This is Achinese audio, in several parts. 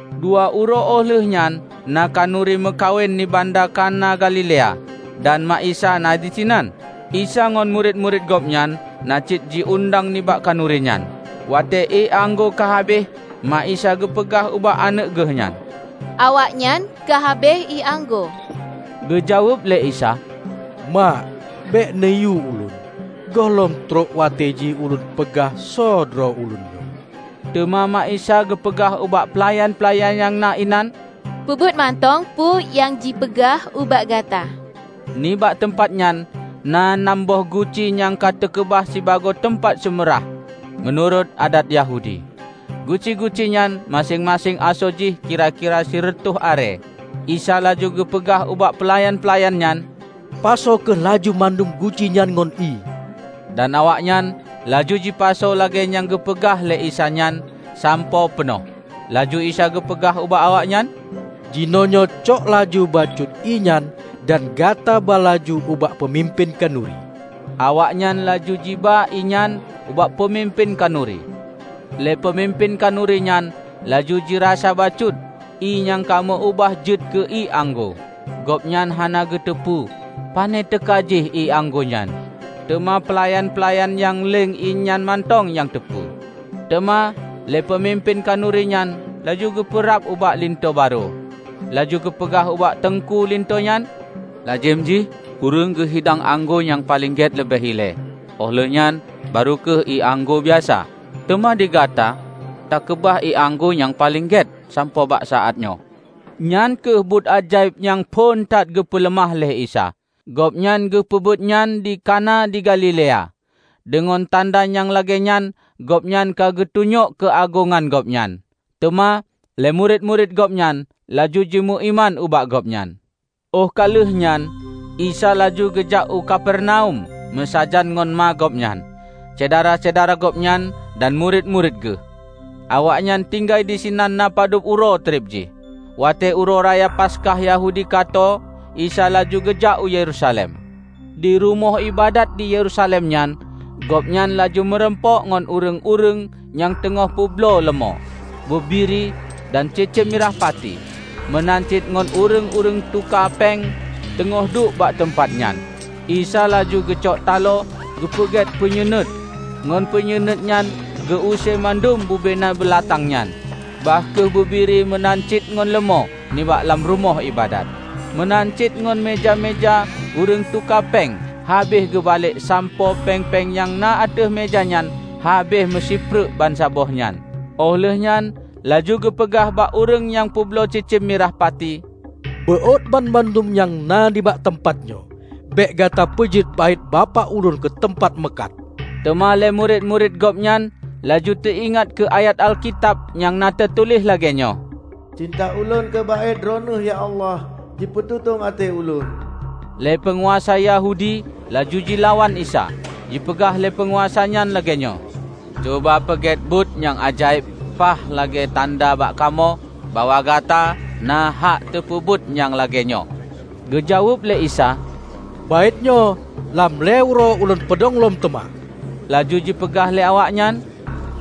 Dua uroe óh lheueh nyan na khanuri meukawen di banda Kana Galilea, dan mak Isa na disinan. Isa ngon murit-murit Gobnyan na cit jiundang nibak khanuri nyan. Watée ié anggô ka habéh, mak Isa geupeugah ubak aneuëk geuhnyan, "Awaknyan ka habéh ié anggô." Geujaweueb lé Isa, "Mak, bék neuyue ulôn. Gohlom trok watée jih ulôn peugah soe droe Ulôn nyoe." Teuma mak Isa geupeugah ubak peulayan-peulayan nyang na inan, "Peubuet mantong peue nyang jipeugah ubak gata." Nibak teumpat nyan na nam boh guci nyang ka teukeubah sibagoe teumpat seumeu rhah meunurot adat Yahudi. Guci-gucinyan maséng-maséng asoe jih kira-kira sireutoh arée. Isa laju geupeugah ubak peulayan-peulayan nyan, "Pasoe kheueh laju mandum guci nyan ngon ié," dan awaknyan laju jipasoe lagée nyang geupeurintah lé Isa nyan sampoe peunoh. Laju Isa geupeugah ubak awaknyan, "Jinoenyoe cok laju bacut ié nyan dan gata ba laju ubak peumimpén khanuri." Awaknyan laju jiba ié nyan ubak peumimpén khanuri, lé peumimpén khanurinyan laju jirasa bacut ié nyang ka meu-ubah jeuet keu ié anggô. (Gobnyan hana geuteupeue pane teuka jih ié anggô nyan, teuma peulayan-peulayan nyang leng ié nyan mantong nyang teupeu.) Teuma lé peumimpén khanurinyan laju geupeurab ubak linto barô, laju geupeugah ubak teungku linto nyan, "Lazem jih ureuëng geuhidang anggô nyang paleng gét leubeh ilée, óh lheueh nyan barô kheueh ié anggô biasa. Teuma digata takeubah ié anggô nyang paleng gét sampoe bak saátnyoe!" Nyan kheueh buet ajaéb nyang phon that geupeuleumah lé Isa. Gobnyan geupeubuetnyan di Kana di Galilea. Deungon tanda nyang lagéenyan gobnyan ka geutunyok keuagongan Gobnyan. Teuma lé murit-murit Gobnyan laju jimeuiman ubak Gobnyan. Óh ka lheueh nyan Isa laju geujak u Kapernaum meusajan ngon ma Gobnyan, syedara-syedara Gobnyan dan murit-murit Geuh. Awaknyan tinggai disinan na padub uroe treb jih. Watée Uroe Raya Paskah Yahudi ka tô, Isa laju geujak u Yerusalem. Di Rumoh iébadat di Yerusalem nyan Gobnyan laju meurumpok ngon ureuëng-ureuëng nyang teungoh peubloe leumô, bubiri dan cicém mirah pati; meunan cit ngon ureuëng-ureuëng tuka péng teungoh duek bak teumpat nyan. Isa laju geucok talo geupeugét peunyuenuet ngon peunyuenuet nyan geu-use mandum bubena beulatang nyan, bah kheueh bubiri meunan cit ngon leumô, nibak lam Rumoh iébadat. Meunan cit ngon meuja-meuja ureuëng tuka péng habéh geubalek sampoe péng-péng nyang na ateueh meuja nyan habéh meusipreuk bansaboh nyan. Óh lheuehnyan laju geupeugah bak ureuëng nyang peubloe cicém mirah pati, "Beuôt banmandum nyang na nibak teumpat nyoe. Bék gata peujeuet Baét Bapak ulôn keuteumpat meukat!" Teuma lé murit-murit Gobnyan laju teuingat keu ayat Alkitab nyang na teutuléh lagée nyoe, "Cinta ulôn keu Baét Droeneueh ya Allah, jipeututong até ulôn." Lé peunguasa Yahudi laju jilawan Isa, jipeugah lé peunguasa nyan lagéenyoe, "Cuba peugét buet nyang ajaéb paih lagée tanda bak kamoe bahwa gata na hak tapeubuet nyang lagée nyoe." Geujaweueb lé Isa, "Baétnyoe, lam lhée uroe Ulôn peudong lom teuma." Laju jipeugah lé awaknyan,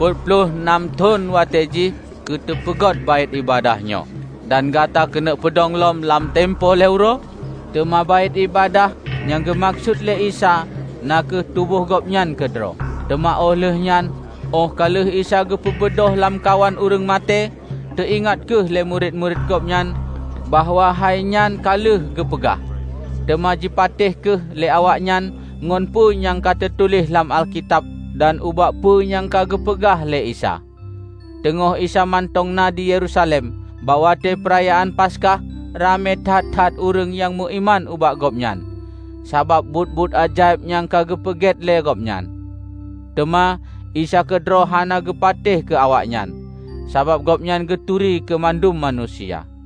"Peuet ploh nam thon watée jih keu teupeugot Baét Iébadat nyoe. Dan gata keuneuk peudong lom lam tempo lhée uroe?" Teuma Baét Iébadat nyang geumeukeusut lé Isa na kheueh tuboh Gobnyan keudroe. Teuma óh lheueh nyan, óh ka lheueh Isa geupeubeudôh lam kawan ureuëng maté, teuingat kheueh lé murit-murit Gobnyan bahwa hainyan ka lheueh geupeugah. Teuma jipatéh kheueh lé awaknyan ngon peue nyang ka teutuléh lam Alkitab dan ubak peue nyang ka geupeugah lé Isa. Teungoh Isa mantong na di Yerusalem bak watée Peurayaan Paskah, ramé that-that ureuëng nyang meuiman ubak Gobnyan sabab buet-buet ajaéb nyang ka geupeubuet lé Gobnyan. Teuma Isa keudroe hana geupatéh keu awaknyan, sabab gobnyan geuturi keu mandum manusia.